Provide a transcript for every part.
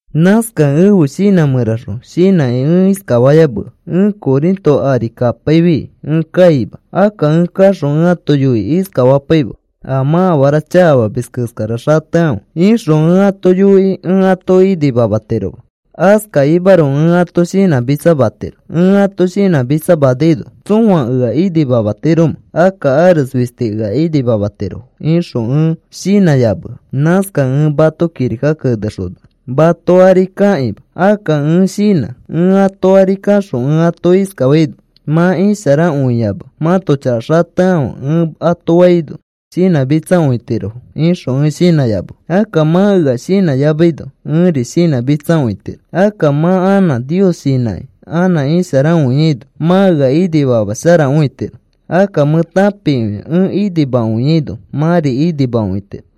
Nãskakẽ ẽfe shinã mẽraxõ shinãkĩ ẽ iskafayamea: “Ẽ Corinto ari kapaifi ẽ kaima. Akka ẽ kaxõ ẽ ato yoikĩ iskafapaima: ‘A mã afara chakafamis keskara xatekãfe,’ ixõ ẽ ato yoikĩ ẽ ato inimamatiroma. Askakimaroko ẽ ato shinãmitsamatiro. Ẽ ato shinãmitsamanaino, ¿tsõa ea inimamatiromẽ? Akka ares fisti ea inimamatirofo,” ixõ ẽ shinãyamea. Nãskakẽ ẽ mato kirika kenexona, mato ari kakĩma. Akka ẽ shinã, “Ẽ ato ari kaxõ ẽ ato iskafaino: ‘Mã isharakõiyama mãto chaka xatekãfe,’ ẽ ato faino shinãmitsakõitirofo,” ixõ ẽ shinãyamea. Akka mã ea nikayamaino ẽri shinãmitsakõitiro. Akka mã anã Nios nikakĩ anã isharakõiaino, mã ea inimamasharakõitiro. Akka mẽ tãpikõia ẽ inimakõiaino mãri inimakõitiro.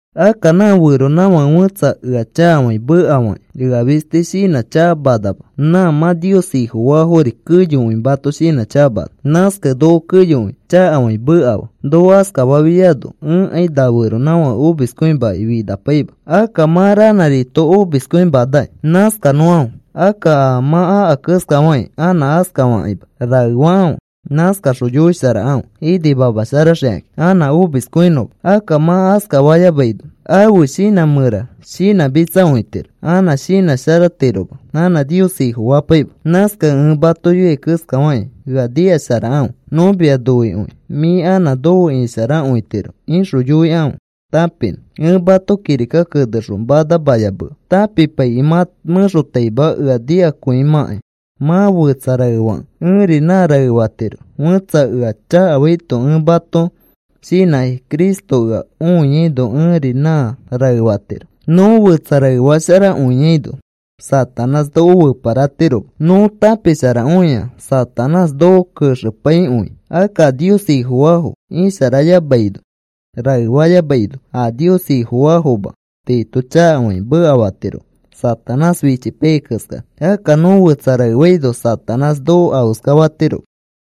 Akka nã feronãfake fẽtsa ea chakafakĩ mekafakĩ ea fisti shinãchakamanama, nã mã Nios Ifofaafori keyokõi mato shinãchakamana. Nãskakẽ noko keyokõi chakafakĩ mekafaa. Noko askafafiaino ẽkai na feronãfake omiskõimaki finapaima. Akka mã ranãrito omiskõimanakĩ nãskanõkãfe. Akka a mã aka keskafakĩ anã askafakĩma rae fakãfe. Nãskaxõ yoisharakãfe inimamasharaxikakĩ anã omiskõinõma. Akka mã askafayamaino ãfe shinã mẽra shinãmitsakõitiro anã shinãsharatiroma anã Nios Ifofapaima. Nãskakẽ ẽ mato yoiai keskafakĩ ea nikasharakãfe. “Nõ mia noikõi. Mĩ anã nofe isharakõitiro,” ixõ yoikãfe tãpinõ. Ẽ mato kirika kenexõ manamayamea tãpipaikĩ mã mẽxotaima ea nikakõimãkai. Mã fetsa raefakẽ ẽri nã raefatiro. Fẽtsa ea chakafaito ẽ mato shinãkĩ Cristo ea õiaino ẽri nã raefatiro. Nõ fetsa raefasharakõiaino Satanás noko feparatiroma. Nõ tãpisharakõia Satanás noko kexepaikõi. Akka a Nios Ifofaafo isharayamaino, raefayamaino, a Nios Ifofaafoma tiito chakafakĩ mekafatirofo Satanás fichipaiyai keskara. Akka nõ fetsa raefaino Satanás noko afeskafatiroma.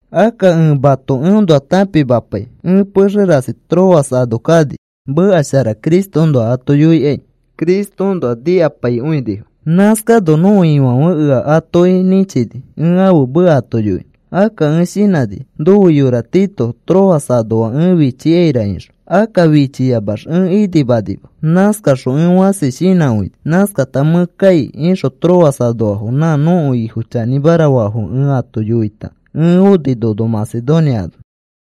Akka ẽ mato eõnoa tãpimapai. Ẽ pexe rasi Troas ano kani meka shara Cristoõnoa ato yoikai. Cristoõnoa nikapaikõinifo. Nãskano nõko Ifãfe ea atoki nĩchini ẽ ãfe meka ato yoinõ. Akka ẽ shinãni nofe yora Tito Troas anoa ẽ fichikaira ixõ. Akka fichiyamax ẽ inimanima. Nãskaxõ ẽ fãsi shinãkõini. Nãskata, “Mẽ kai,” ixõ Troas anoafo nã nõko Ifo chanĩmara faafo ẽ ato yoita ẽ oni nono Macedonia ano.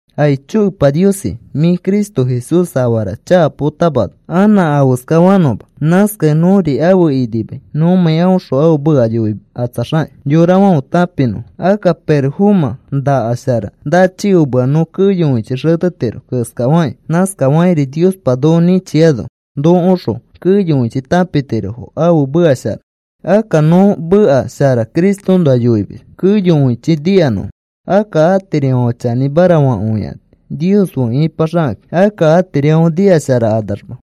Aicho Epa Niosi, mĩ Cristo Jesús afara chaka potamana anã afeskafanõma. Nãskakẽ nõri afe inimai nõmãi aõxõ ãfe meka yoikatsaxakĩ yorafãfe tãpinõfo. Akka pirofomã nakas shara nachikomea nõ keyokõichi xetetiro keskafaki, nãskafakĩri Niospa noko nĩchiano nokoõxõ keyokõichi tãpitirofo ãfe meka shara. Akka nõ meka shara Cristoõnoa yoimis keyokõichi nikanõfo. Akka atirifãfe chanĩmara fakõikani, Nios fe ipaxakakĩ. Akka atirifãfe nikasharakanamax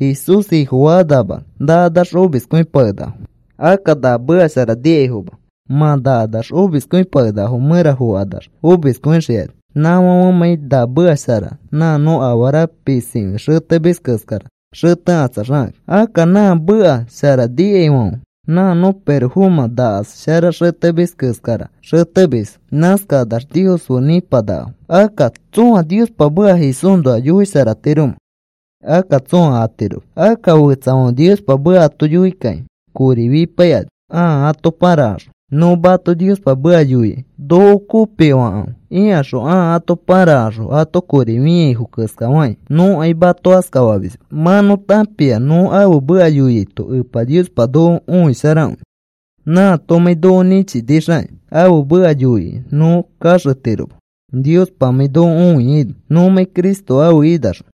Jesús Ifofakanamax nakanax omiskõipakenakafo. Akka na meka shara nikaifoma mã nakanax omiskõipakenakafo mẽra fokanax omiskõixikani, nãfãfemãi na meka shara nã nõ afara pisikõi xetemis keskara xetekatsaxakakĩ. Akka nã meka shara nikaifãfe nã nõ pirofomã nakas shara xetemis keskara xetemisfo. Nãskakanax Nios fe nĩpanakafo. Akka, ¿tsõa Niospa meka Jesúsnoa yoisharatiromẽ? Akka tsõa atiroma. Akka fetsafãfe Niospa meka ato yoikakĩ kori fipaikani ãa ato pãrakaxõ. Nõ mato Niospa meka yoikai noko kopifakãfe ikaxõ ãa ato pãrakaxõ ato kori fĩaifo keskafakĩ nõkai mato askafamisma. Mã nõ tãpia nõ ãfe meka yoiaito Epa Niospa noko õisharakõi, nãatomãi noko nĩchinixakĩ. Ãfe meka yoikai nõ kaxetiroma, Niospamãi noko õiaino nõmãi Cristo ãfe inaxõ.